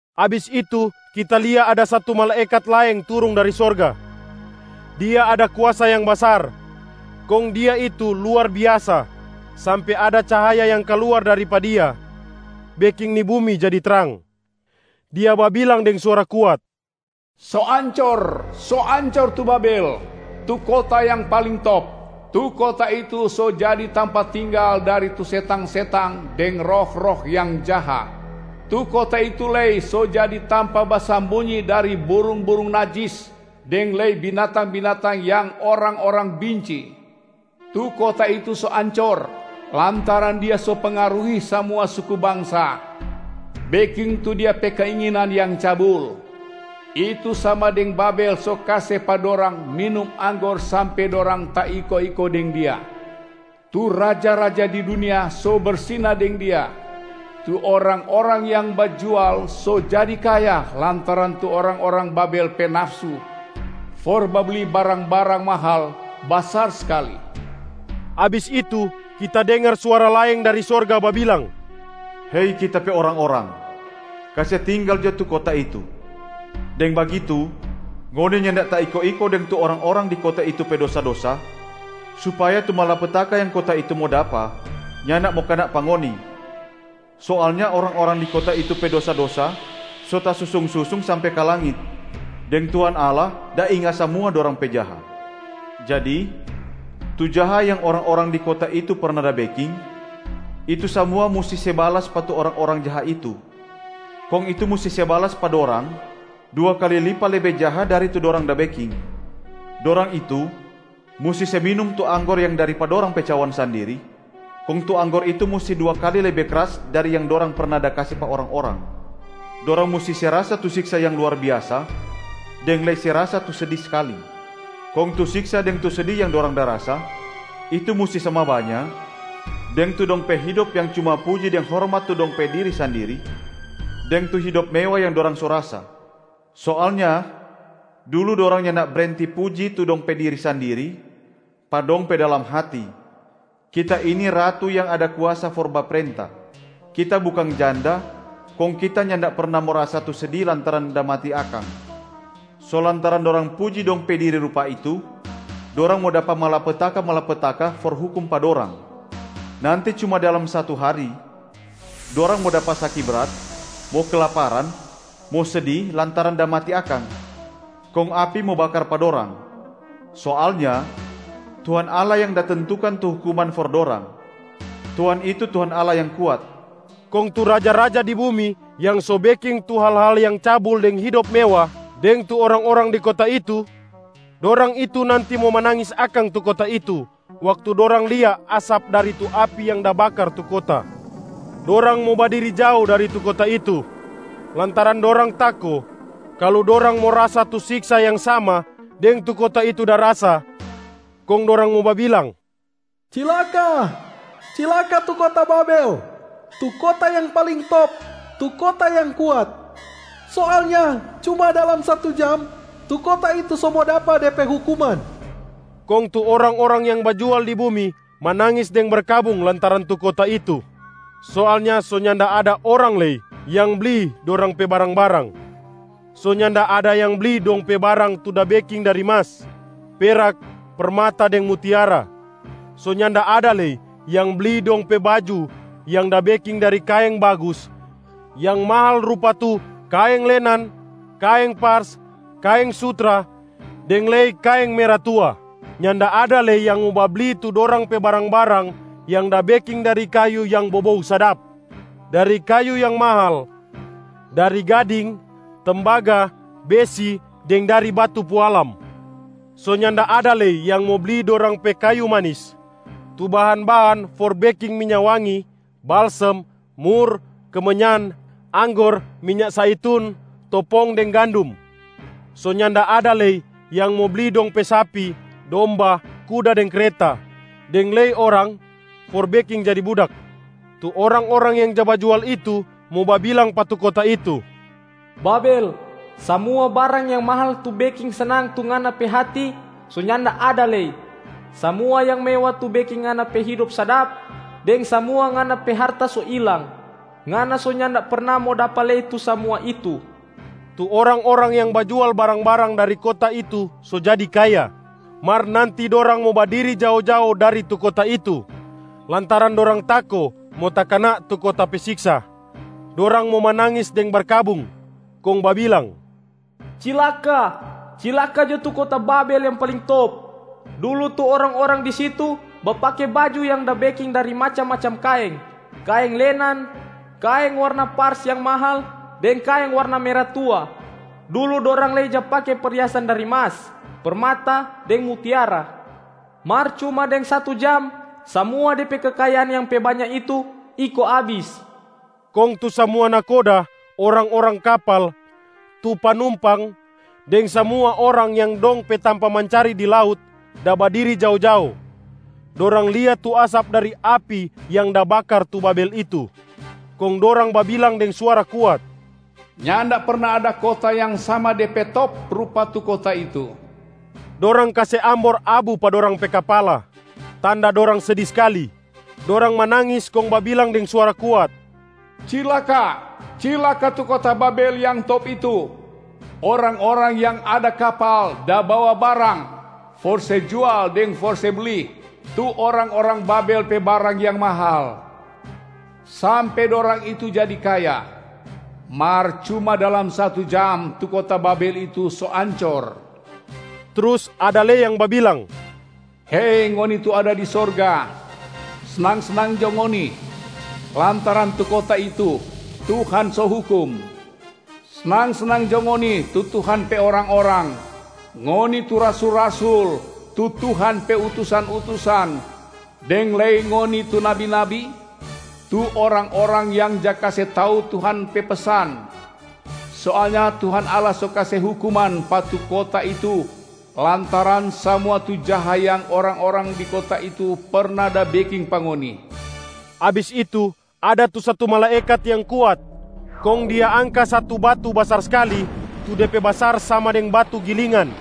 Abis itu kita lia ada satu malaekat laeng turung dari sorga. Dia ada kuasa yang basar, kong dia itu luar biasa sampe ada cahaya yang kaluar dari pa dia beking ni bumi jadi trang. Dia babilang deng suara kuat, “So ancor, so ancor tu Babel, tu kota yang paling top. Tu kota itu so jadi tampa tinggal dari tu setang-setang deng roh-roh yang jaha. Tu kota itu lei so jadi tampa basambunyi dari burung-burung najis deng lei binatang-binatang yang orang-orang binci. Tu kota itu so ancor lantaran dia so pengaruhi samua suku bangsa beking tu dia pe keinginan yang cabul, itu sama deng Babel so kase pa dorang minum anggor sampe dorang taiko-iko deng dia. Tu raja-raja di dunia so bersina deng dia. Tu orang-orang yang bajual so jadi kaya lantaran tu orang-orang Babel pe nafsu for babli barang-barang mahal basar skali.” Abis itu kita dengar suara laeng dari sorga babilang, “Hei Kita pe orang-orang, kase tinggal jo tu kota itu. Deng bagitu ngoni nyanda taiko-iko deng tu orang-orang di kota itu pe dosa-dosa, supaya tu malapetaka yang kota itu mo dapa nyanda mo kana pa ngoni. Soalnya orang-orang di kota itu pe dosa-dosa so tasusung-susung sampe ka langit, deng Tuhan Allah da inga samua dorang pe jaha. Jadi tu jaha yang orang-orang di kota itu perna da beking, itu samua musti se balas pa tu orang-orang jaha itu, kong itu musti se balas pa dorang dua kali lipa lebe jaha dari tu dorang da beking. Dorang itu musti se minum tu anggor yang dari pa dorang pe cawan sandiri, kong tu anggor itu musti dua kali lebe kras dari yang dorang perna da kase pa orang-orang. Dorang musti se rasa tu siksa yang luar biasa deng lei se rasa tu sedi skali. Kong tu siksa deng tu sedi yang dorang da rasa, itu musti sama banya deng tu dong pe hidop yang cuma puji deng hormat tu dong pe diri sandiri deng tu hidop mewa yang dorang so rasa. Soalnya dulu dorang nyanda brenti puji tu dong pe diri sandiri pa dong pe dalam hati, ‘Kita ini ratu yang ada kuasa for baprenta! Kita bukang janda, kong kita nyanda perna mo rasa tu sedi lantaran da mati akang.’ So lantaran dorang puji dong pe diri rupa itu, dorang mo dapa malapetaka-malapetaka for hukum pa dorang. Nanti cuma dalam satu hari, dorang mo dapa saki brat, mo kelaparan, mo sedi lantaran da mati akang, kong api mo bakar pa dorang. Soalnya Tuhan Allah yang da tentukan tu hukuman for dorang, Tuhan itu Tuhan Allah yang kuat.” Kong tu raja-raja di bumi yang so beking tu hal-hal yang cabul deng hidop mewa deng tu orang-orang di kota itu, dorang itu nanti mo manangis akang tu kota itu waktu dorang lia asap dari tu api yang da bakar tu kota. Dorang mo badiri jao dari tu kota itu, lantaran dorang tako kalu dorang mo rasa tu siksa yang sama deng tu kota itu da rasa, kong dorang mo babilang, “Cilaka, cilaka tu kota Babel, tu kota yang paling top, tu kota yang kuat. Soalnya cuma dalam satu jam, tu kota itu so mo dapa de pe hukuman.” Kong tu orang-orang yang bajual di bumi manangis deng berkabung lantaran tu kota itu. Soalnya so nyanda ada orang lei yang bli dorang pe barang-barang. So nyanda ada yang bli dong pe barang tu da beking dari mas, perak, permata deng mutiara. So nyanda ada lei yang bli dong pe baju yang da beking dari kaeng bagus yang mahal rupa tu: kaeng lenan, kaeng pars, kaeng sutra deng lei kaeng mera tua. Nyanda ada lei yang mo babli tu dorang pe barang-barang yang da beking dari kayu yang bobou sadap, dari kayu yang mahal, dari gading, tembaga, besi deng dari batu pualam. So nyanda ada lei yang mo bli dorang pe kayu manis, tu bahan-bahan for beking minya wangi, balsem, mura, kemenyan, anggor, minya zaitun, topong deng gandum. So nyanda ada lei yang mo bli dong pe sapi, domba, kuda deng kreta, deng lei orang for beking jadi budak. Tu orang-orang yang ja bajual itu mo babilang pa tu kota itu, “Babel, samua barang yang mahal tu beking snang tu ngana pe hati so nyanda ada lei. Samua yang mewa tu beking ngana pe hidop sadap, deng samua ngana pe harta so ilang. Ngana so nyanda perna mo dapa lei tu samua itu.” Tu orang-orang yang bajual barang-barang dari kota itu so jadi kaya. Mar nanti dorang mo badiri jao-jao dari tu kota itu lantaran dorang tako mo takana tu kota pe siksa. Dorang mo manangis deng berkabung, kong babilang, “Cilaka, cilaka jo tu kota Babel yang paling top. Dulu tu orang-orang di situ bapake baju yang da beking dari macam-macam kaeng: kaeng lenan, kaeng warna pars yang mahal deng kaeng warna mera tua. Dulu dorang lei ja pake perhiasan dari mas, permata deng mutiara. Mar cuma deng satu jam samua de pe kekayaan yang pe banya itu iko abis.” Kong tu samua nahkoda, orang-orang kapal, tu panumpang deng samua orang yang dong pe tampa mancari di laut da badiri jao-jao. Dorang lia tu asap dari api yang da bakar tu Babel itu, kong dorang babilang deng suara kuat, “Nyanda perna ada kota yang sama de pe top rupa tu kota itu!” Dorang kase ambor abu pa dorang pe kapala, tanda dorang sedi skali. Dorang manangis kong babilang deng suara kuat, “Cilaka, cilaka tu kota Babel yang top itu. Orang-orang yang ada kapal da bawa barang for se jual deng for se bli tu orang-orang Babel pe barang yang mahal, sampe dorang itu jadi kaya. Mar cuma dalam satu jam, tu kota Babel itu so ancor.” Trus ada lei yang babilang, “Hei ngoni tu ada di sorga, snang-snang jo ngoni, lantaran tu kota itu Tuhan so hukum! Snang-snang jo ngoni tu Tuhan pe orang-orang, ngoni tu rasul-rasul tu Tuhan pe utusan-utusan, deng lei ngoni tu nabi-nabi tu orang-orang yang ja kase tau Tuhan pe pesan! Soalnya Tuhan Allah so kase hukuman pa tu kota itu lantaran samua tu jaha yang orang-orang di kota itu perna da beking pa ngoni.” Abis itu ada tu satu malaekat yang kuat, kong dia angka satu batu basar skali tu de pe basar sama deng batu gilingan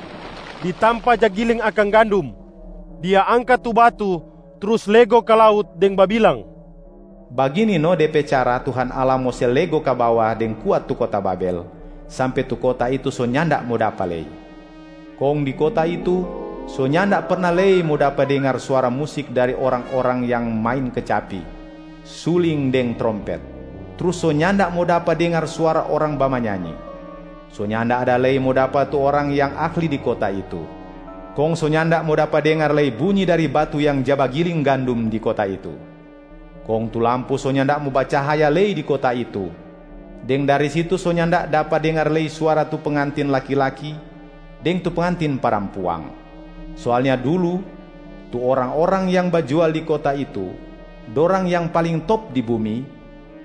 di tampa ja giling akang gandum. Dia angka tu batu trus lego ka laut deng babilang, “Bagini no de pe cara Tuhan Allah mo se lego ka bawa deng kuat tu kota Babel, sampe tu kota itu so nyanda mo dapa lei. Kong di kota itu so nyanda perna lei mo dapa dengar suara musik dari orang-orang yang main kecapi, suling deng trompet, trus so nyanda mo dapa dengar suara orang bamanyanyi. So nyanda ada lei mo dapa tu orang yang ahli di kota itu, kong so nyanda mo dapa dengar lei bunyi dari batu yang ja bagiling gandum di kota itu. Kong tu lampu so nyanda mo bacahaya lei di kota itu, deng dari situ so nyanda dapa dengar lei suara tu pengantin laki-laki deng tu pengantin parampuang. Soalnya dulu tu orang-orang yang ja bajual di kota itu, dorang yang paling top di bumi,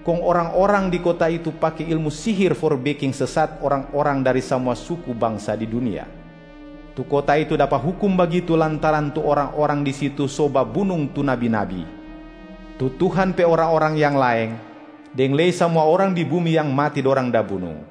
kong orang-orang di kota itu pake ilmu sihir for beking sesat orang-orang dari samua suku bangsa di dunia. Tu kota itu dapa hukum bagitu lantaran tu orang-orang di situ so babunung tu nabi-nabi, tu Tuhan pe orang-orang yang laeng deng lei samua orang di bumi yang mati dorang da bunung.”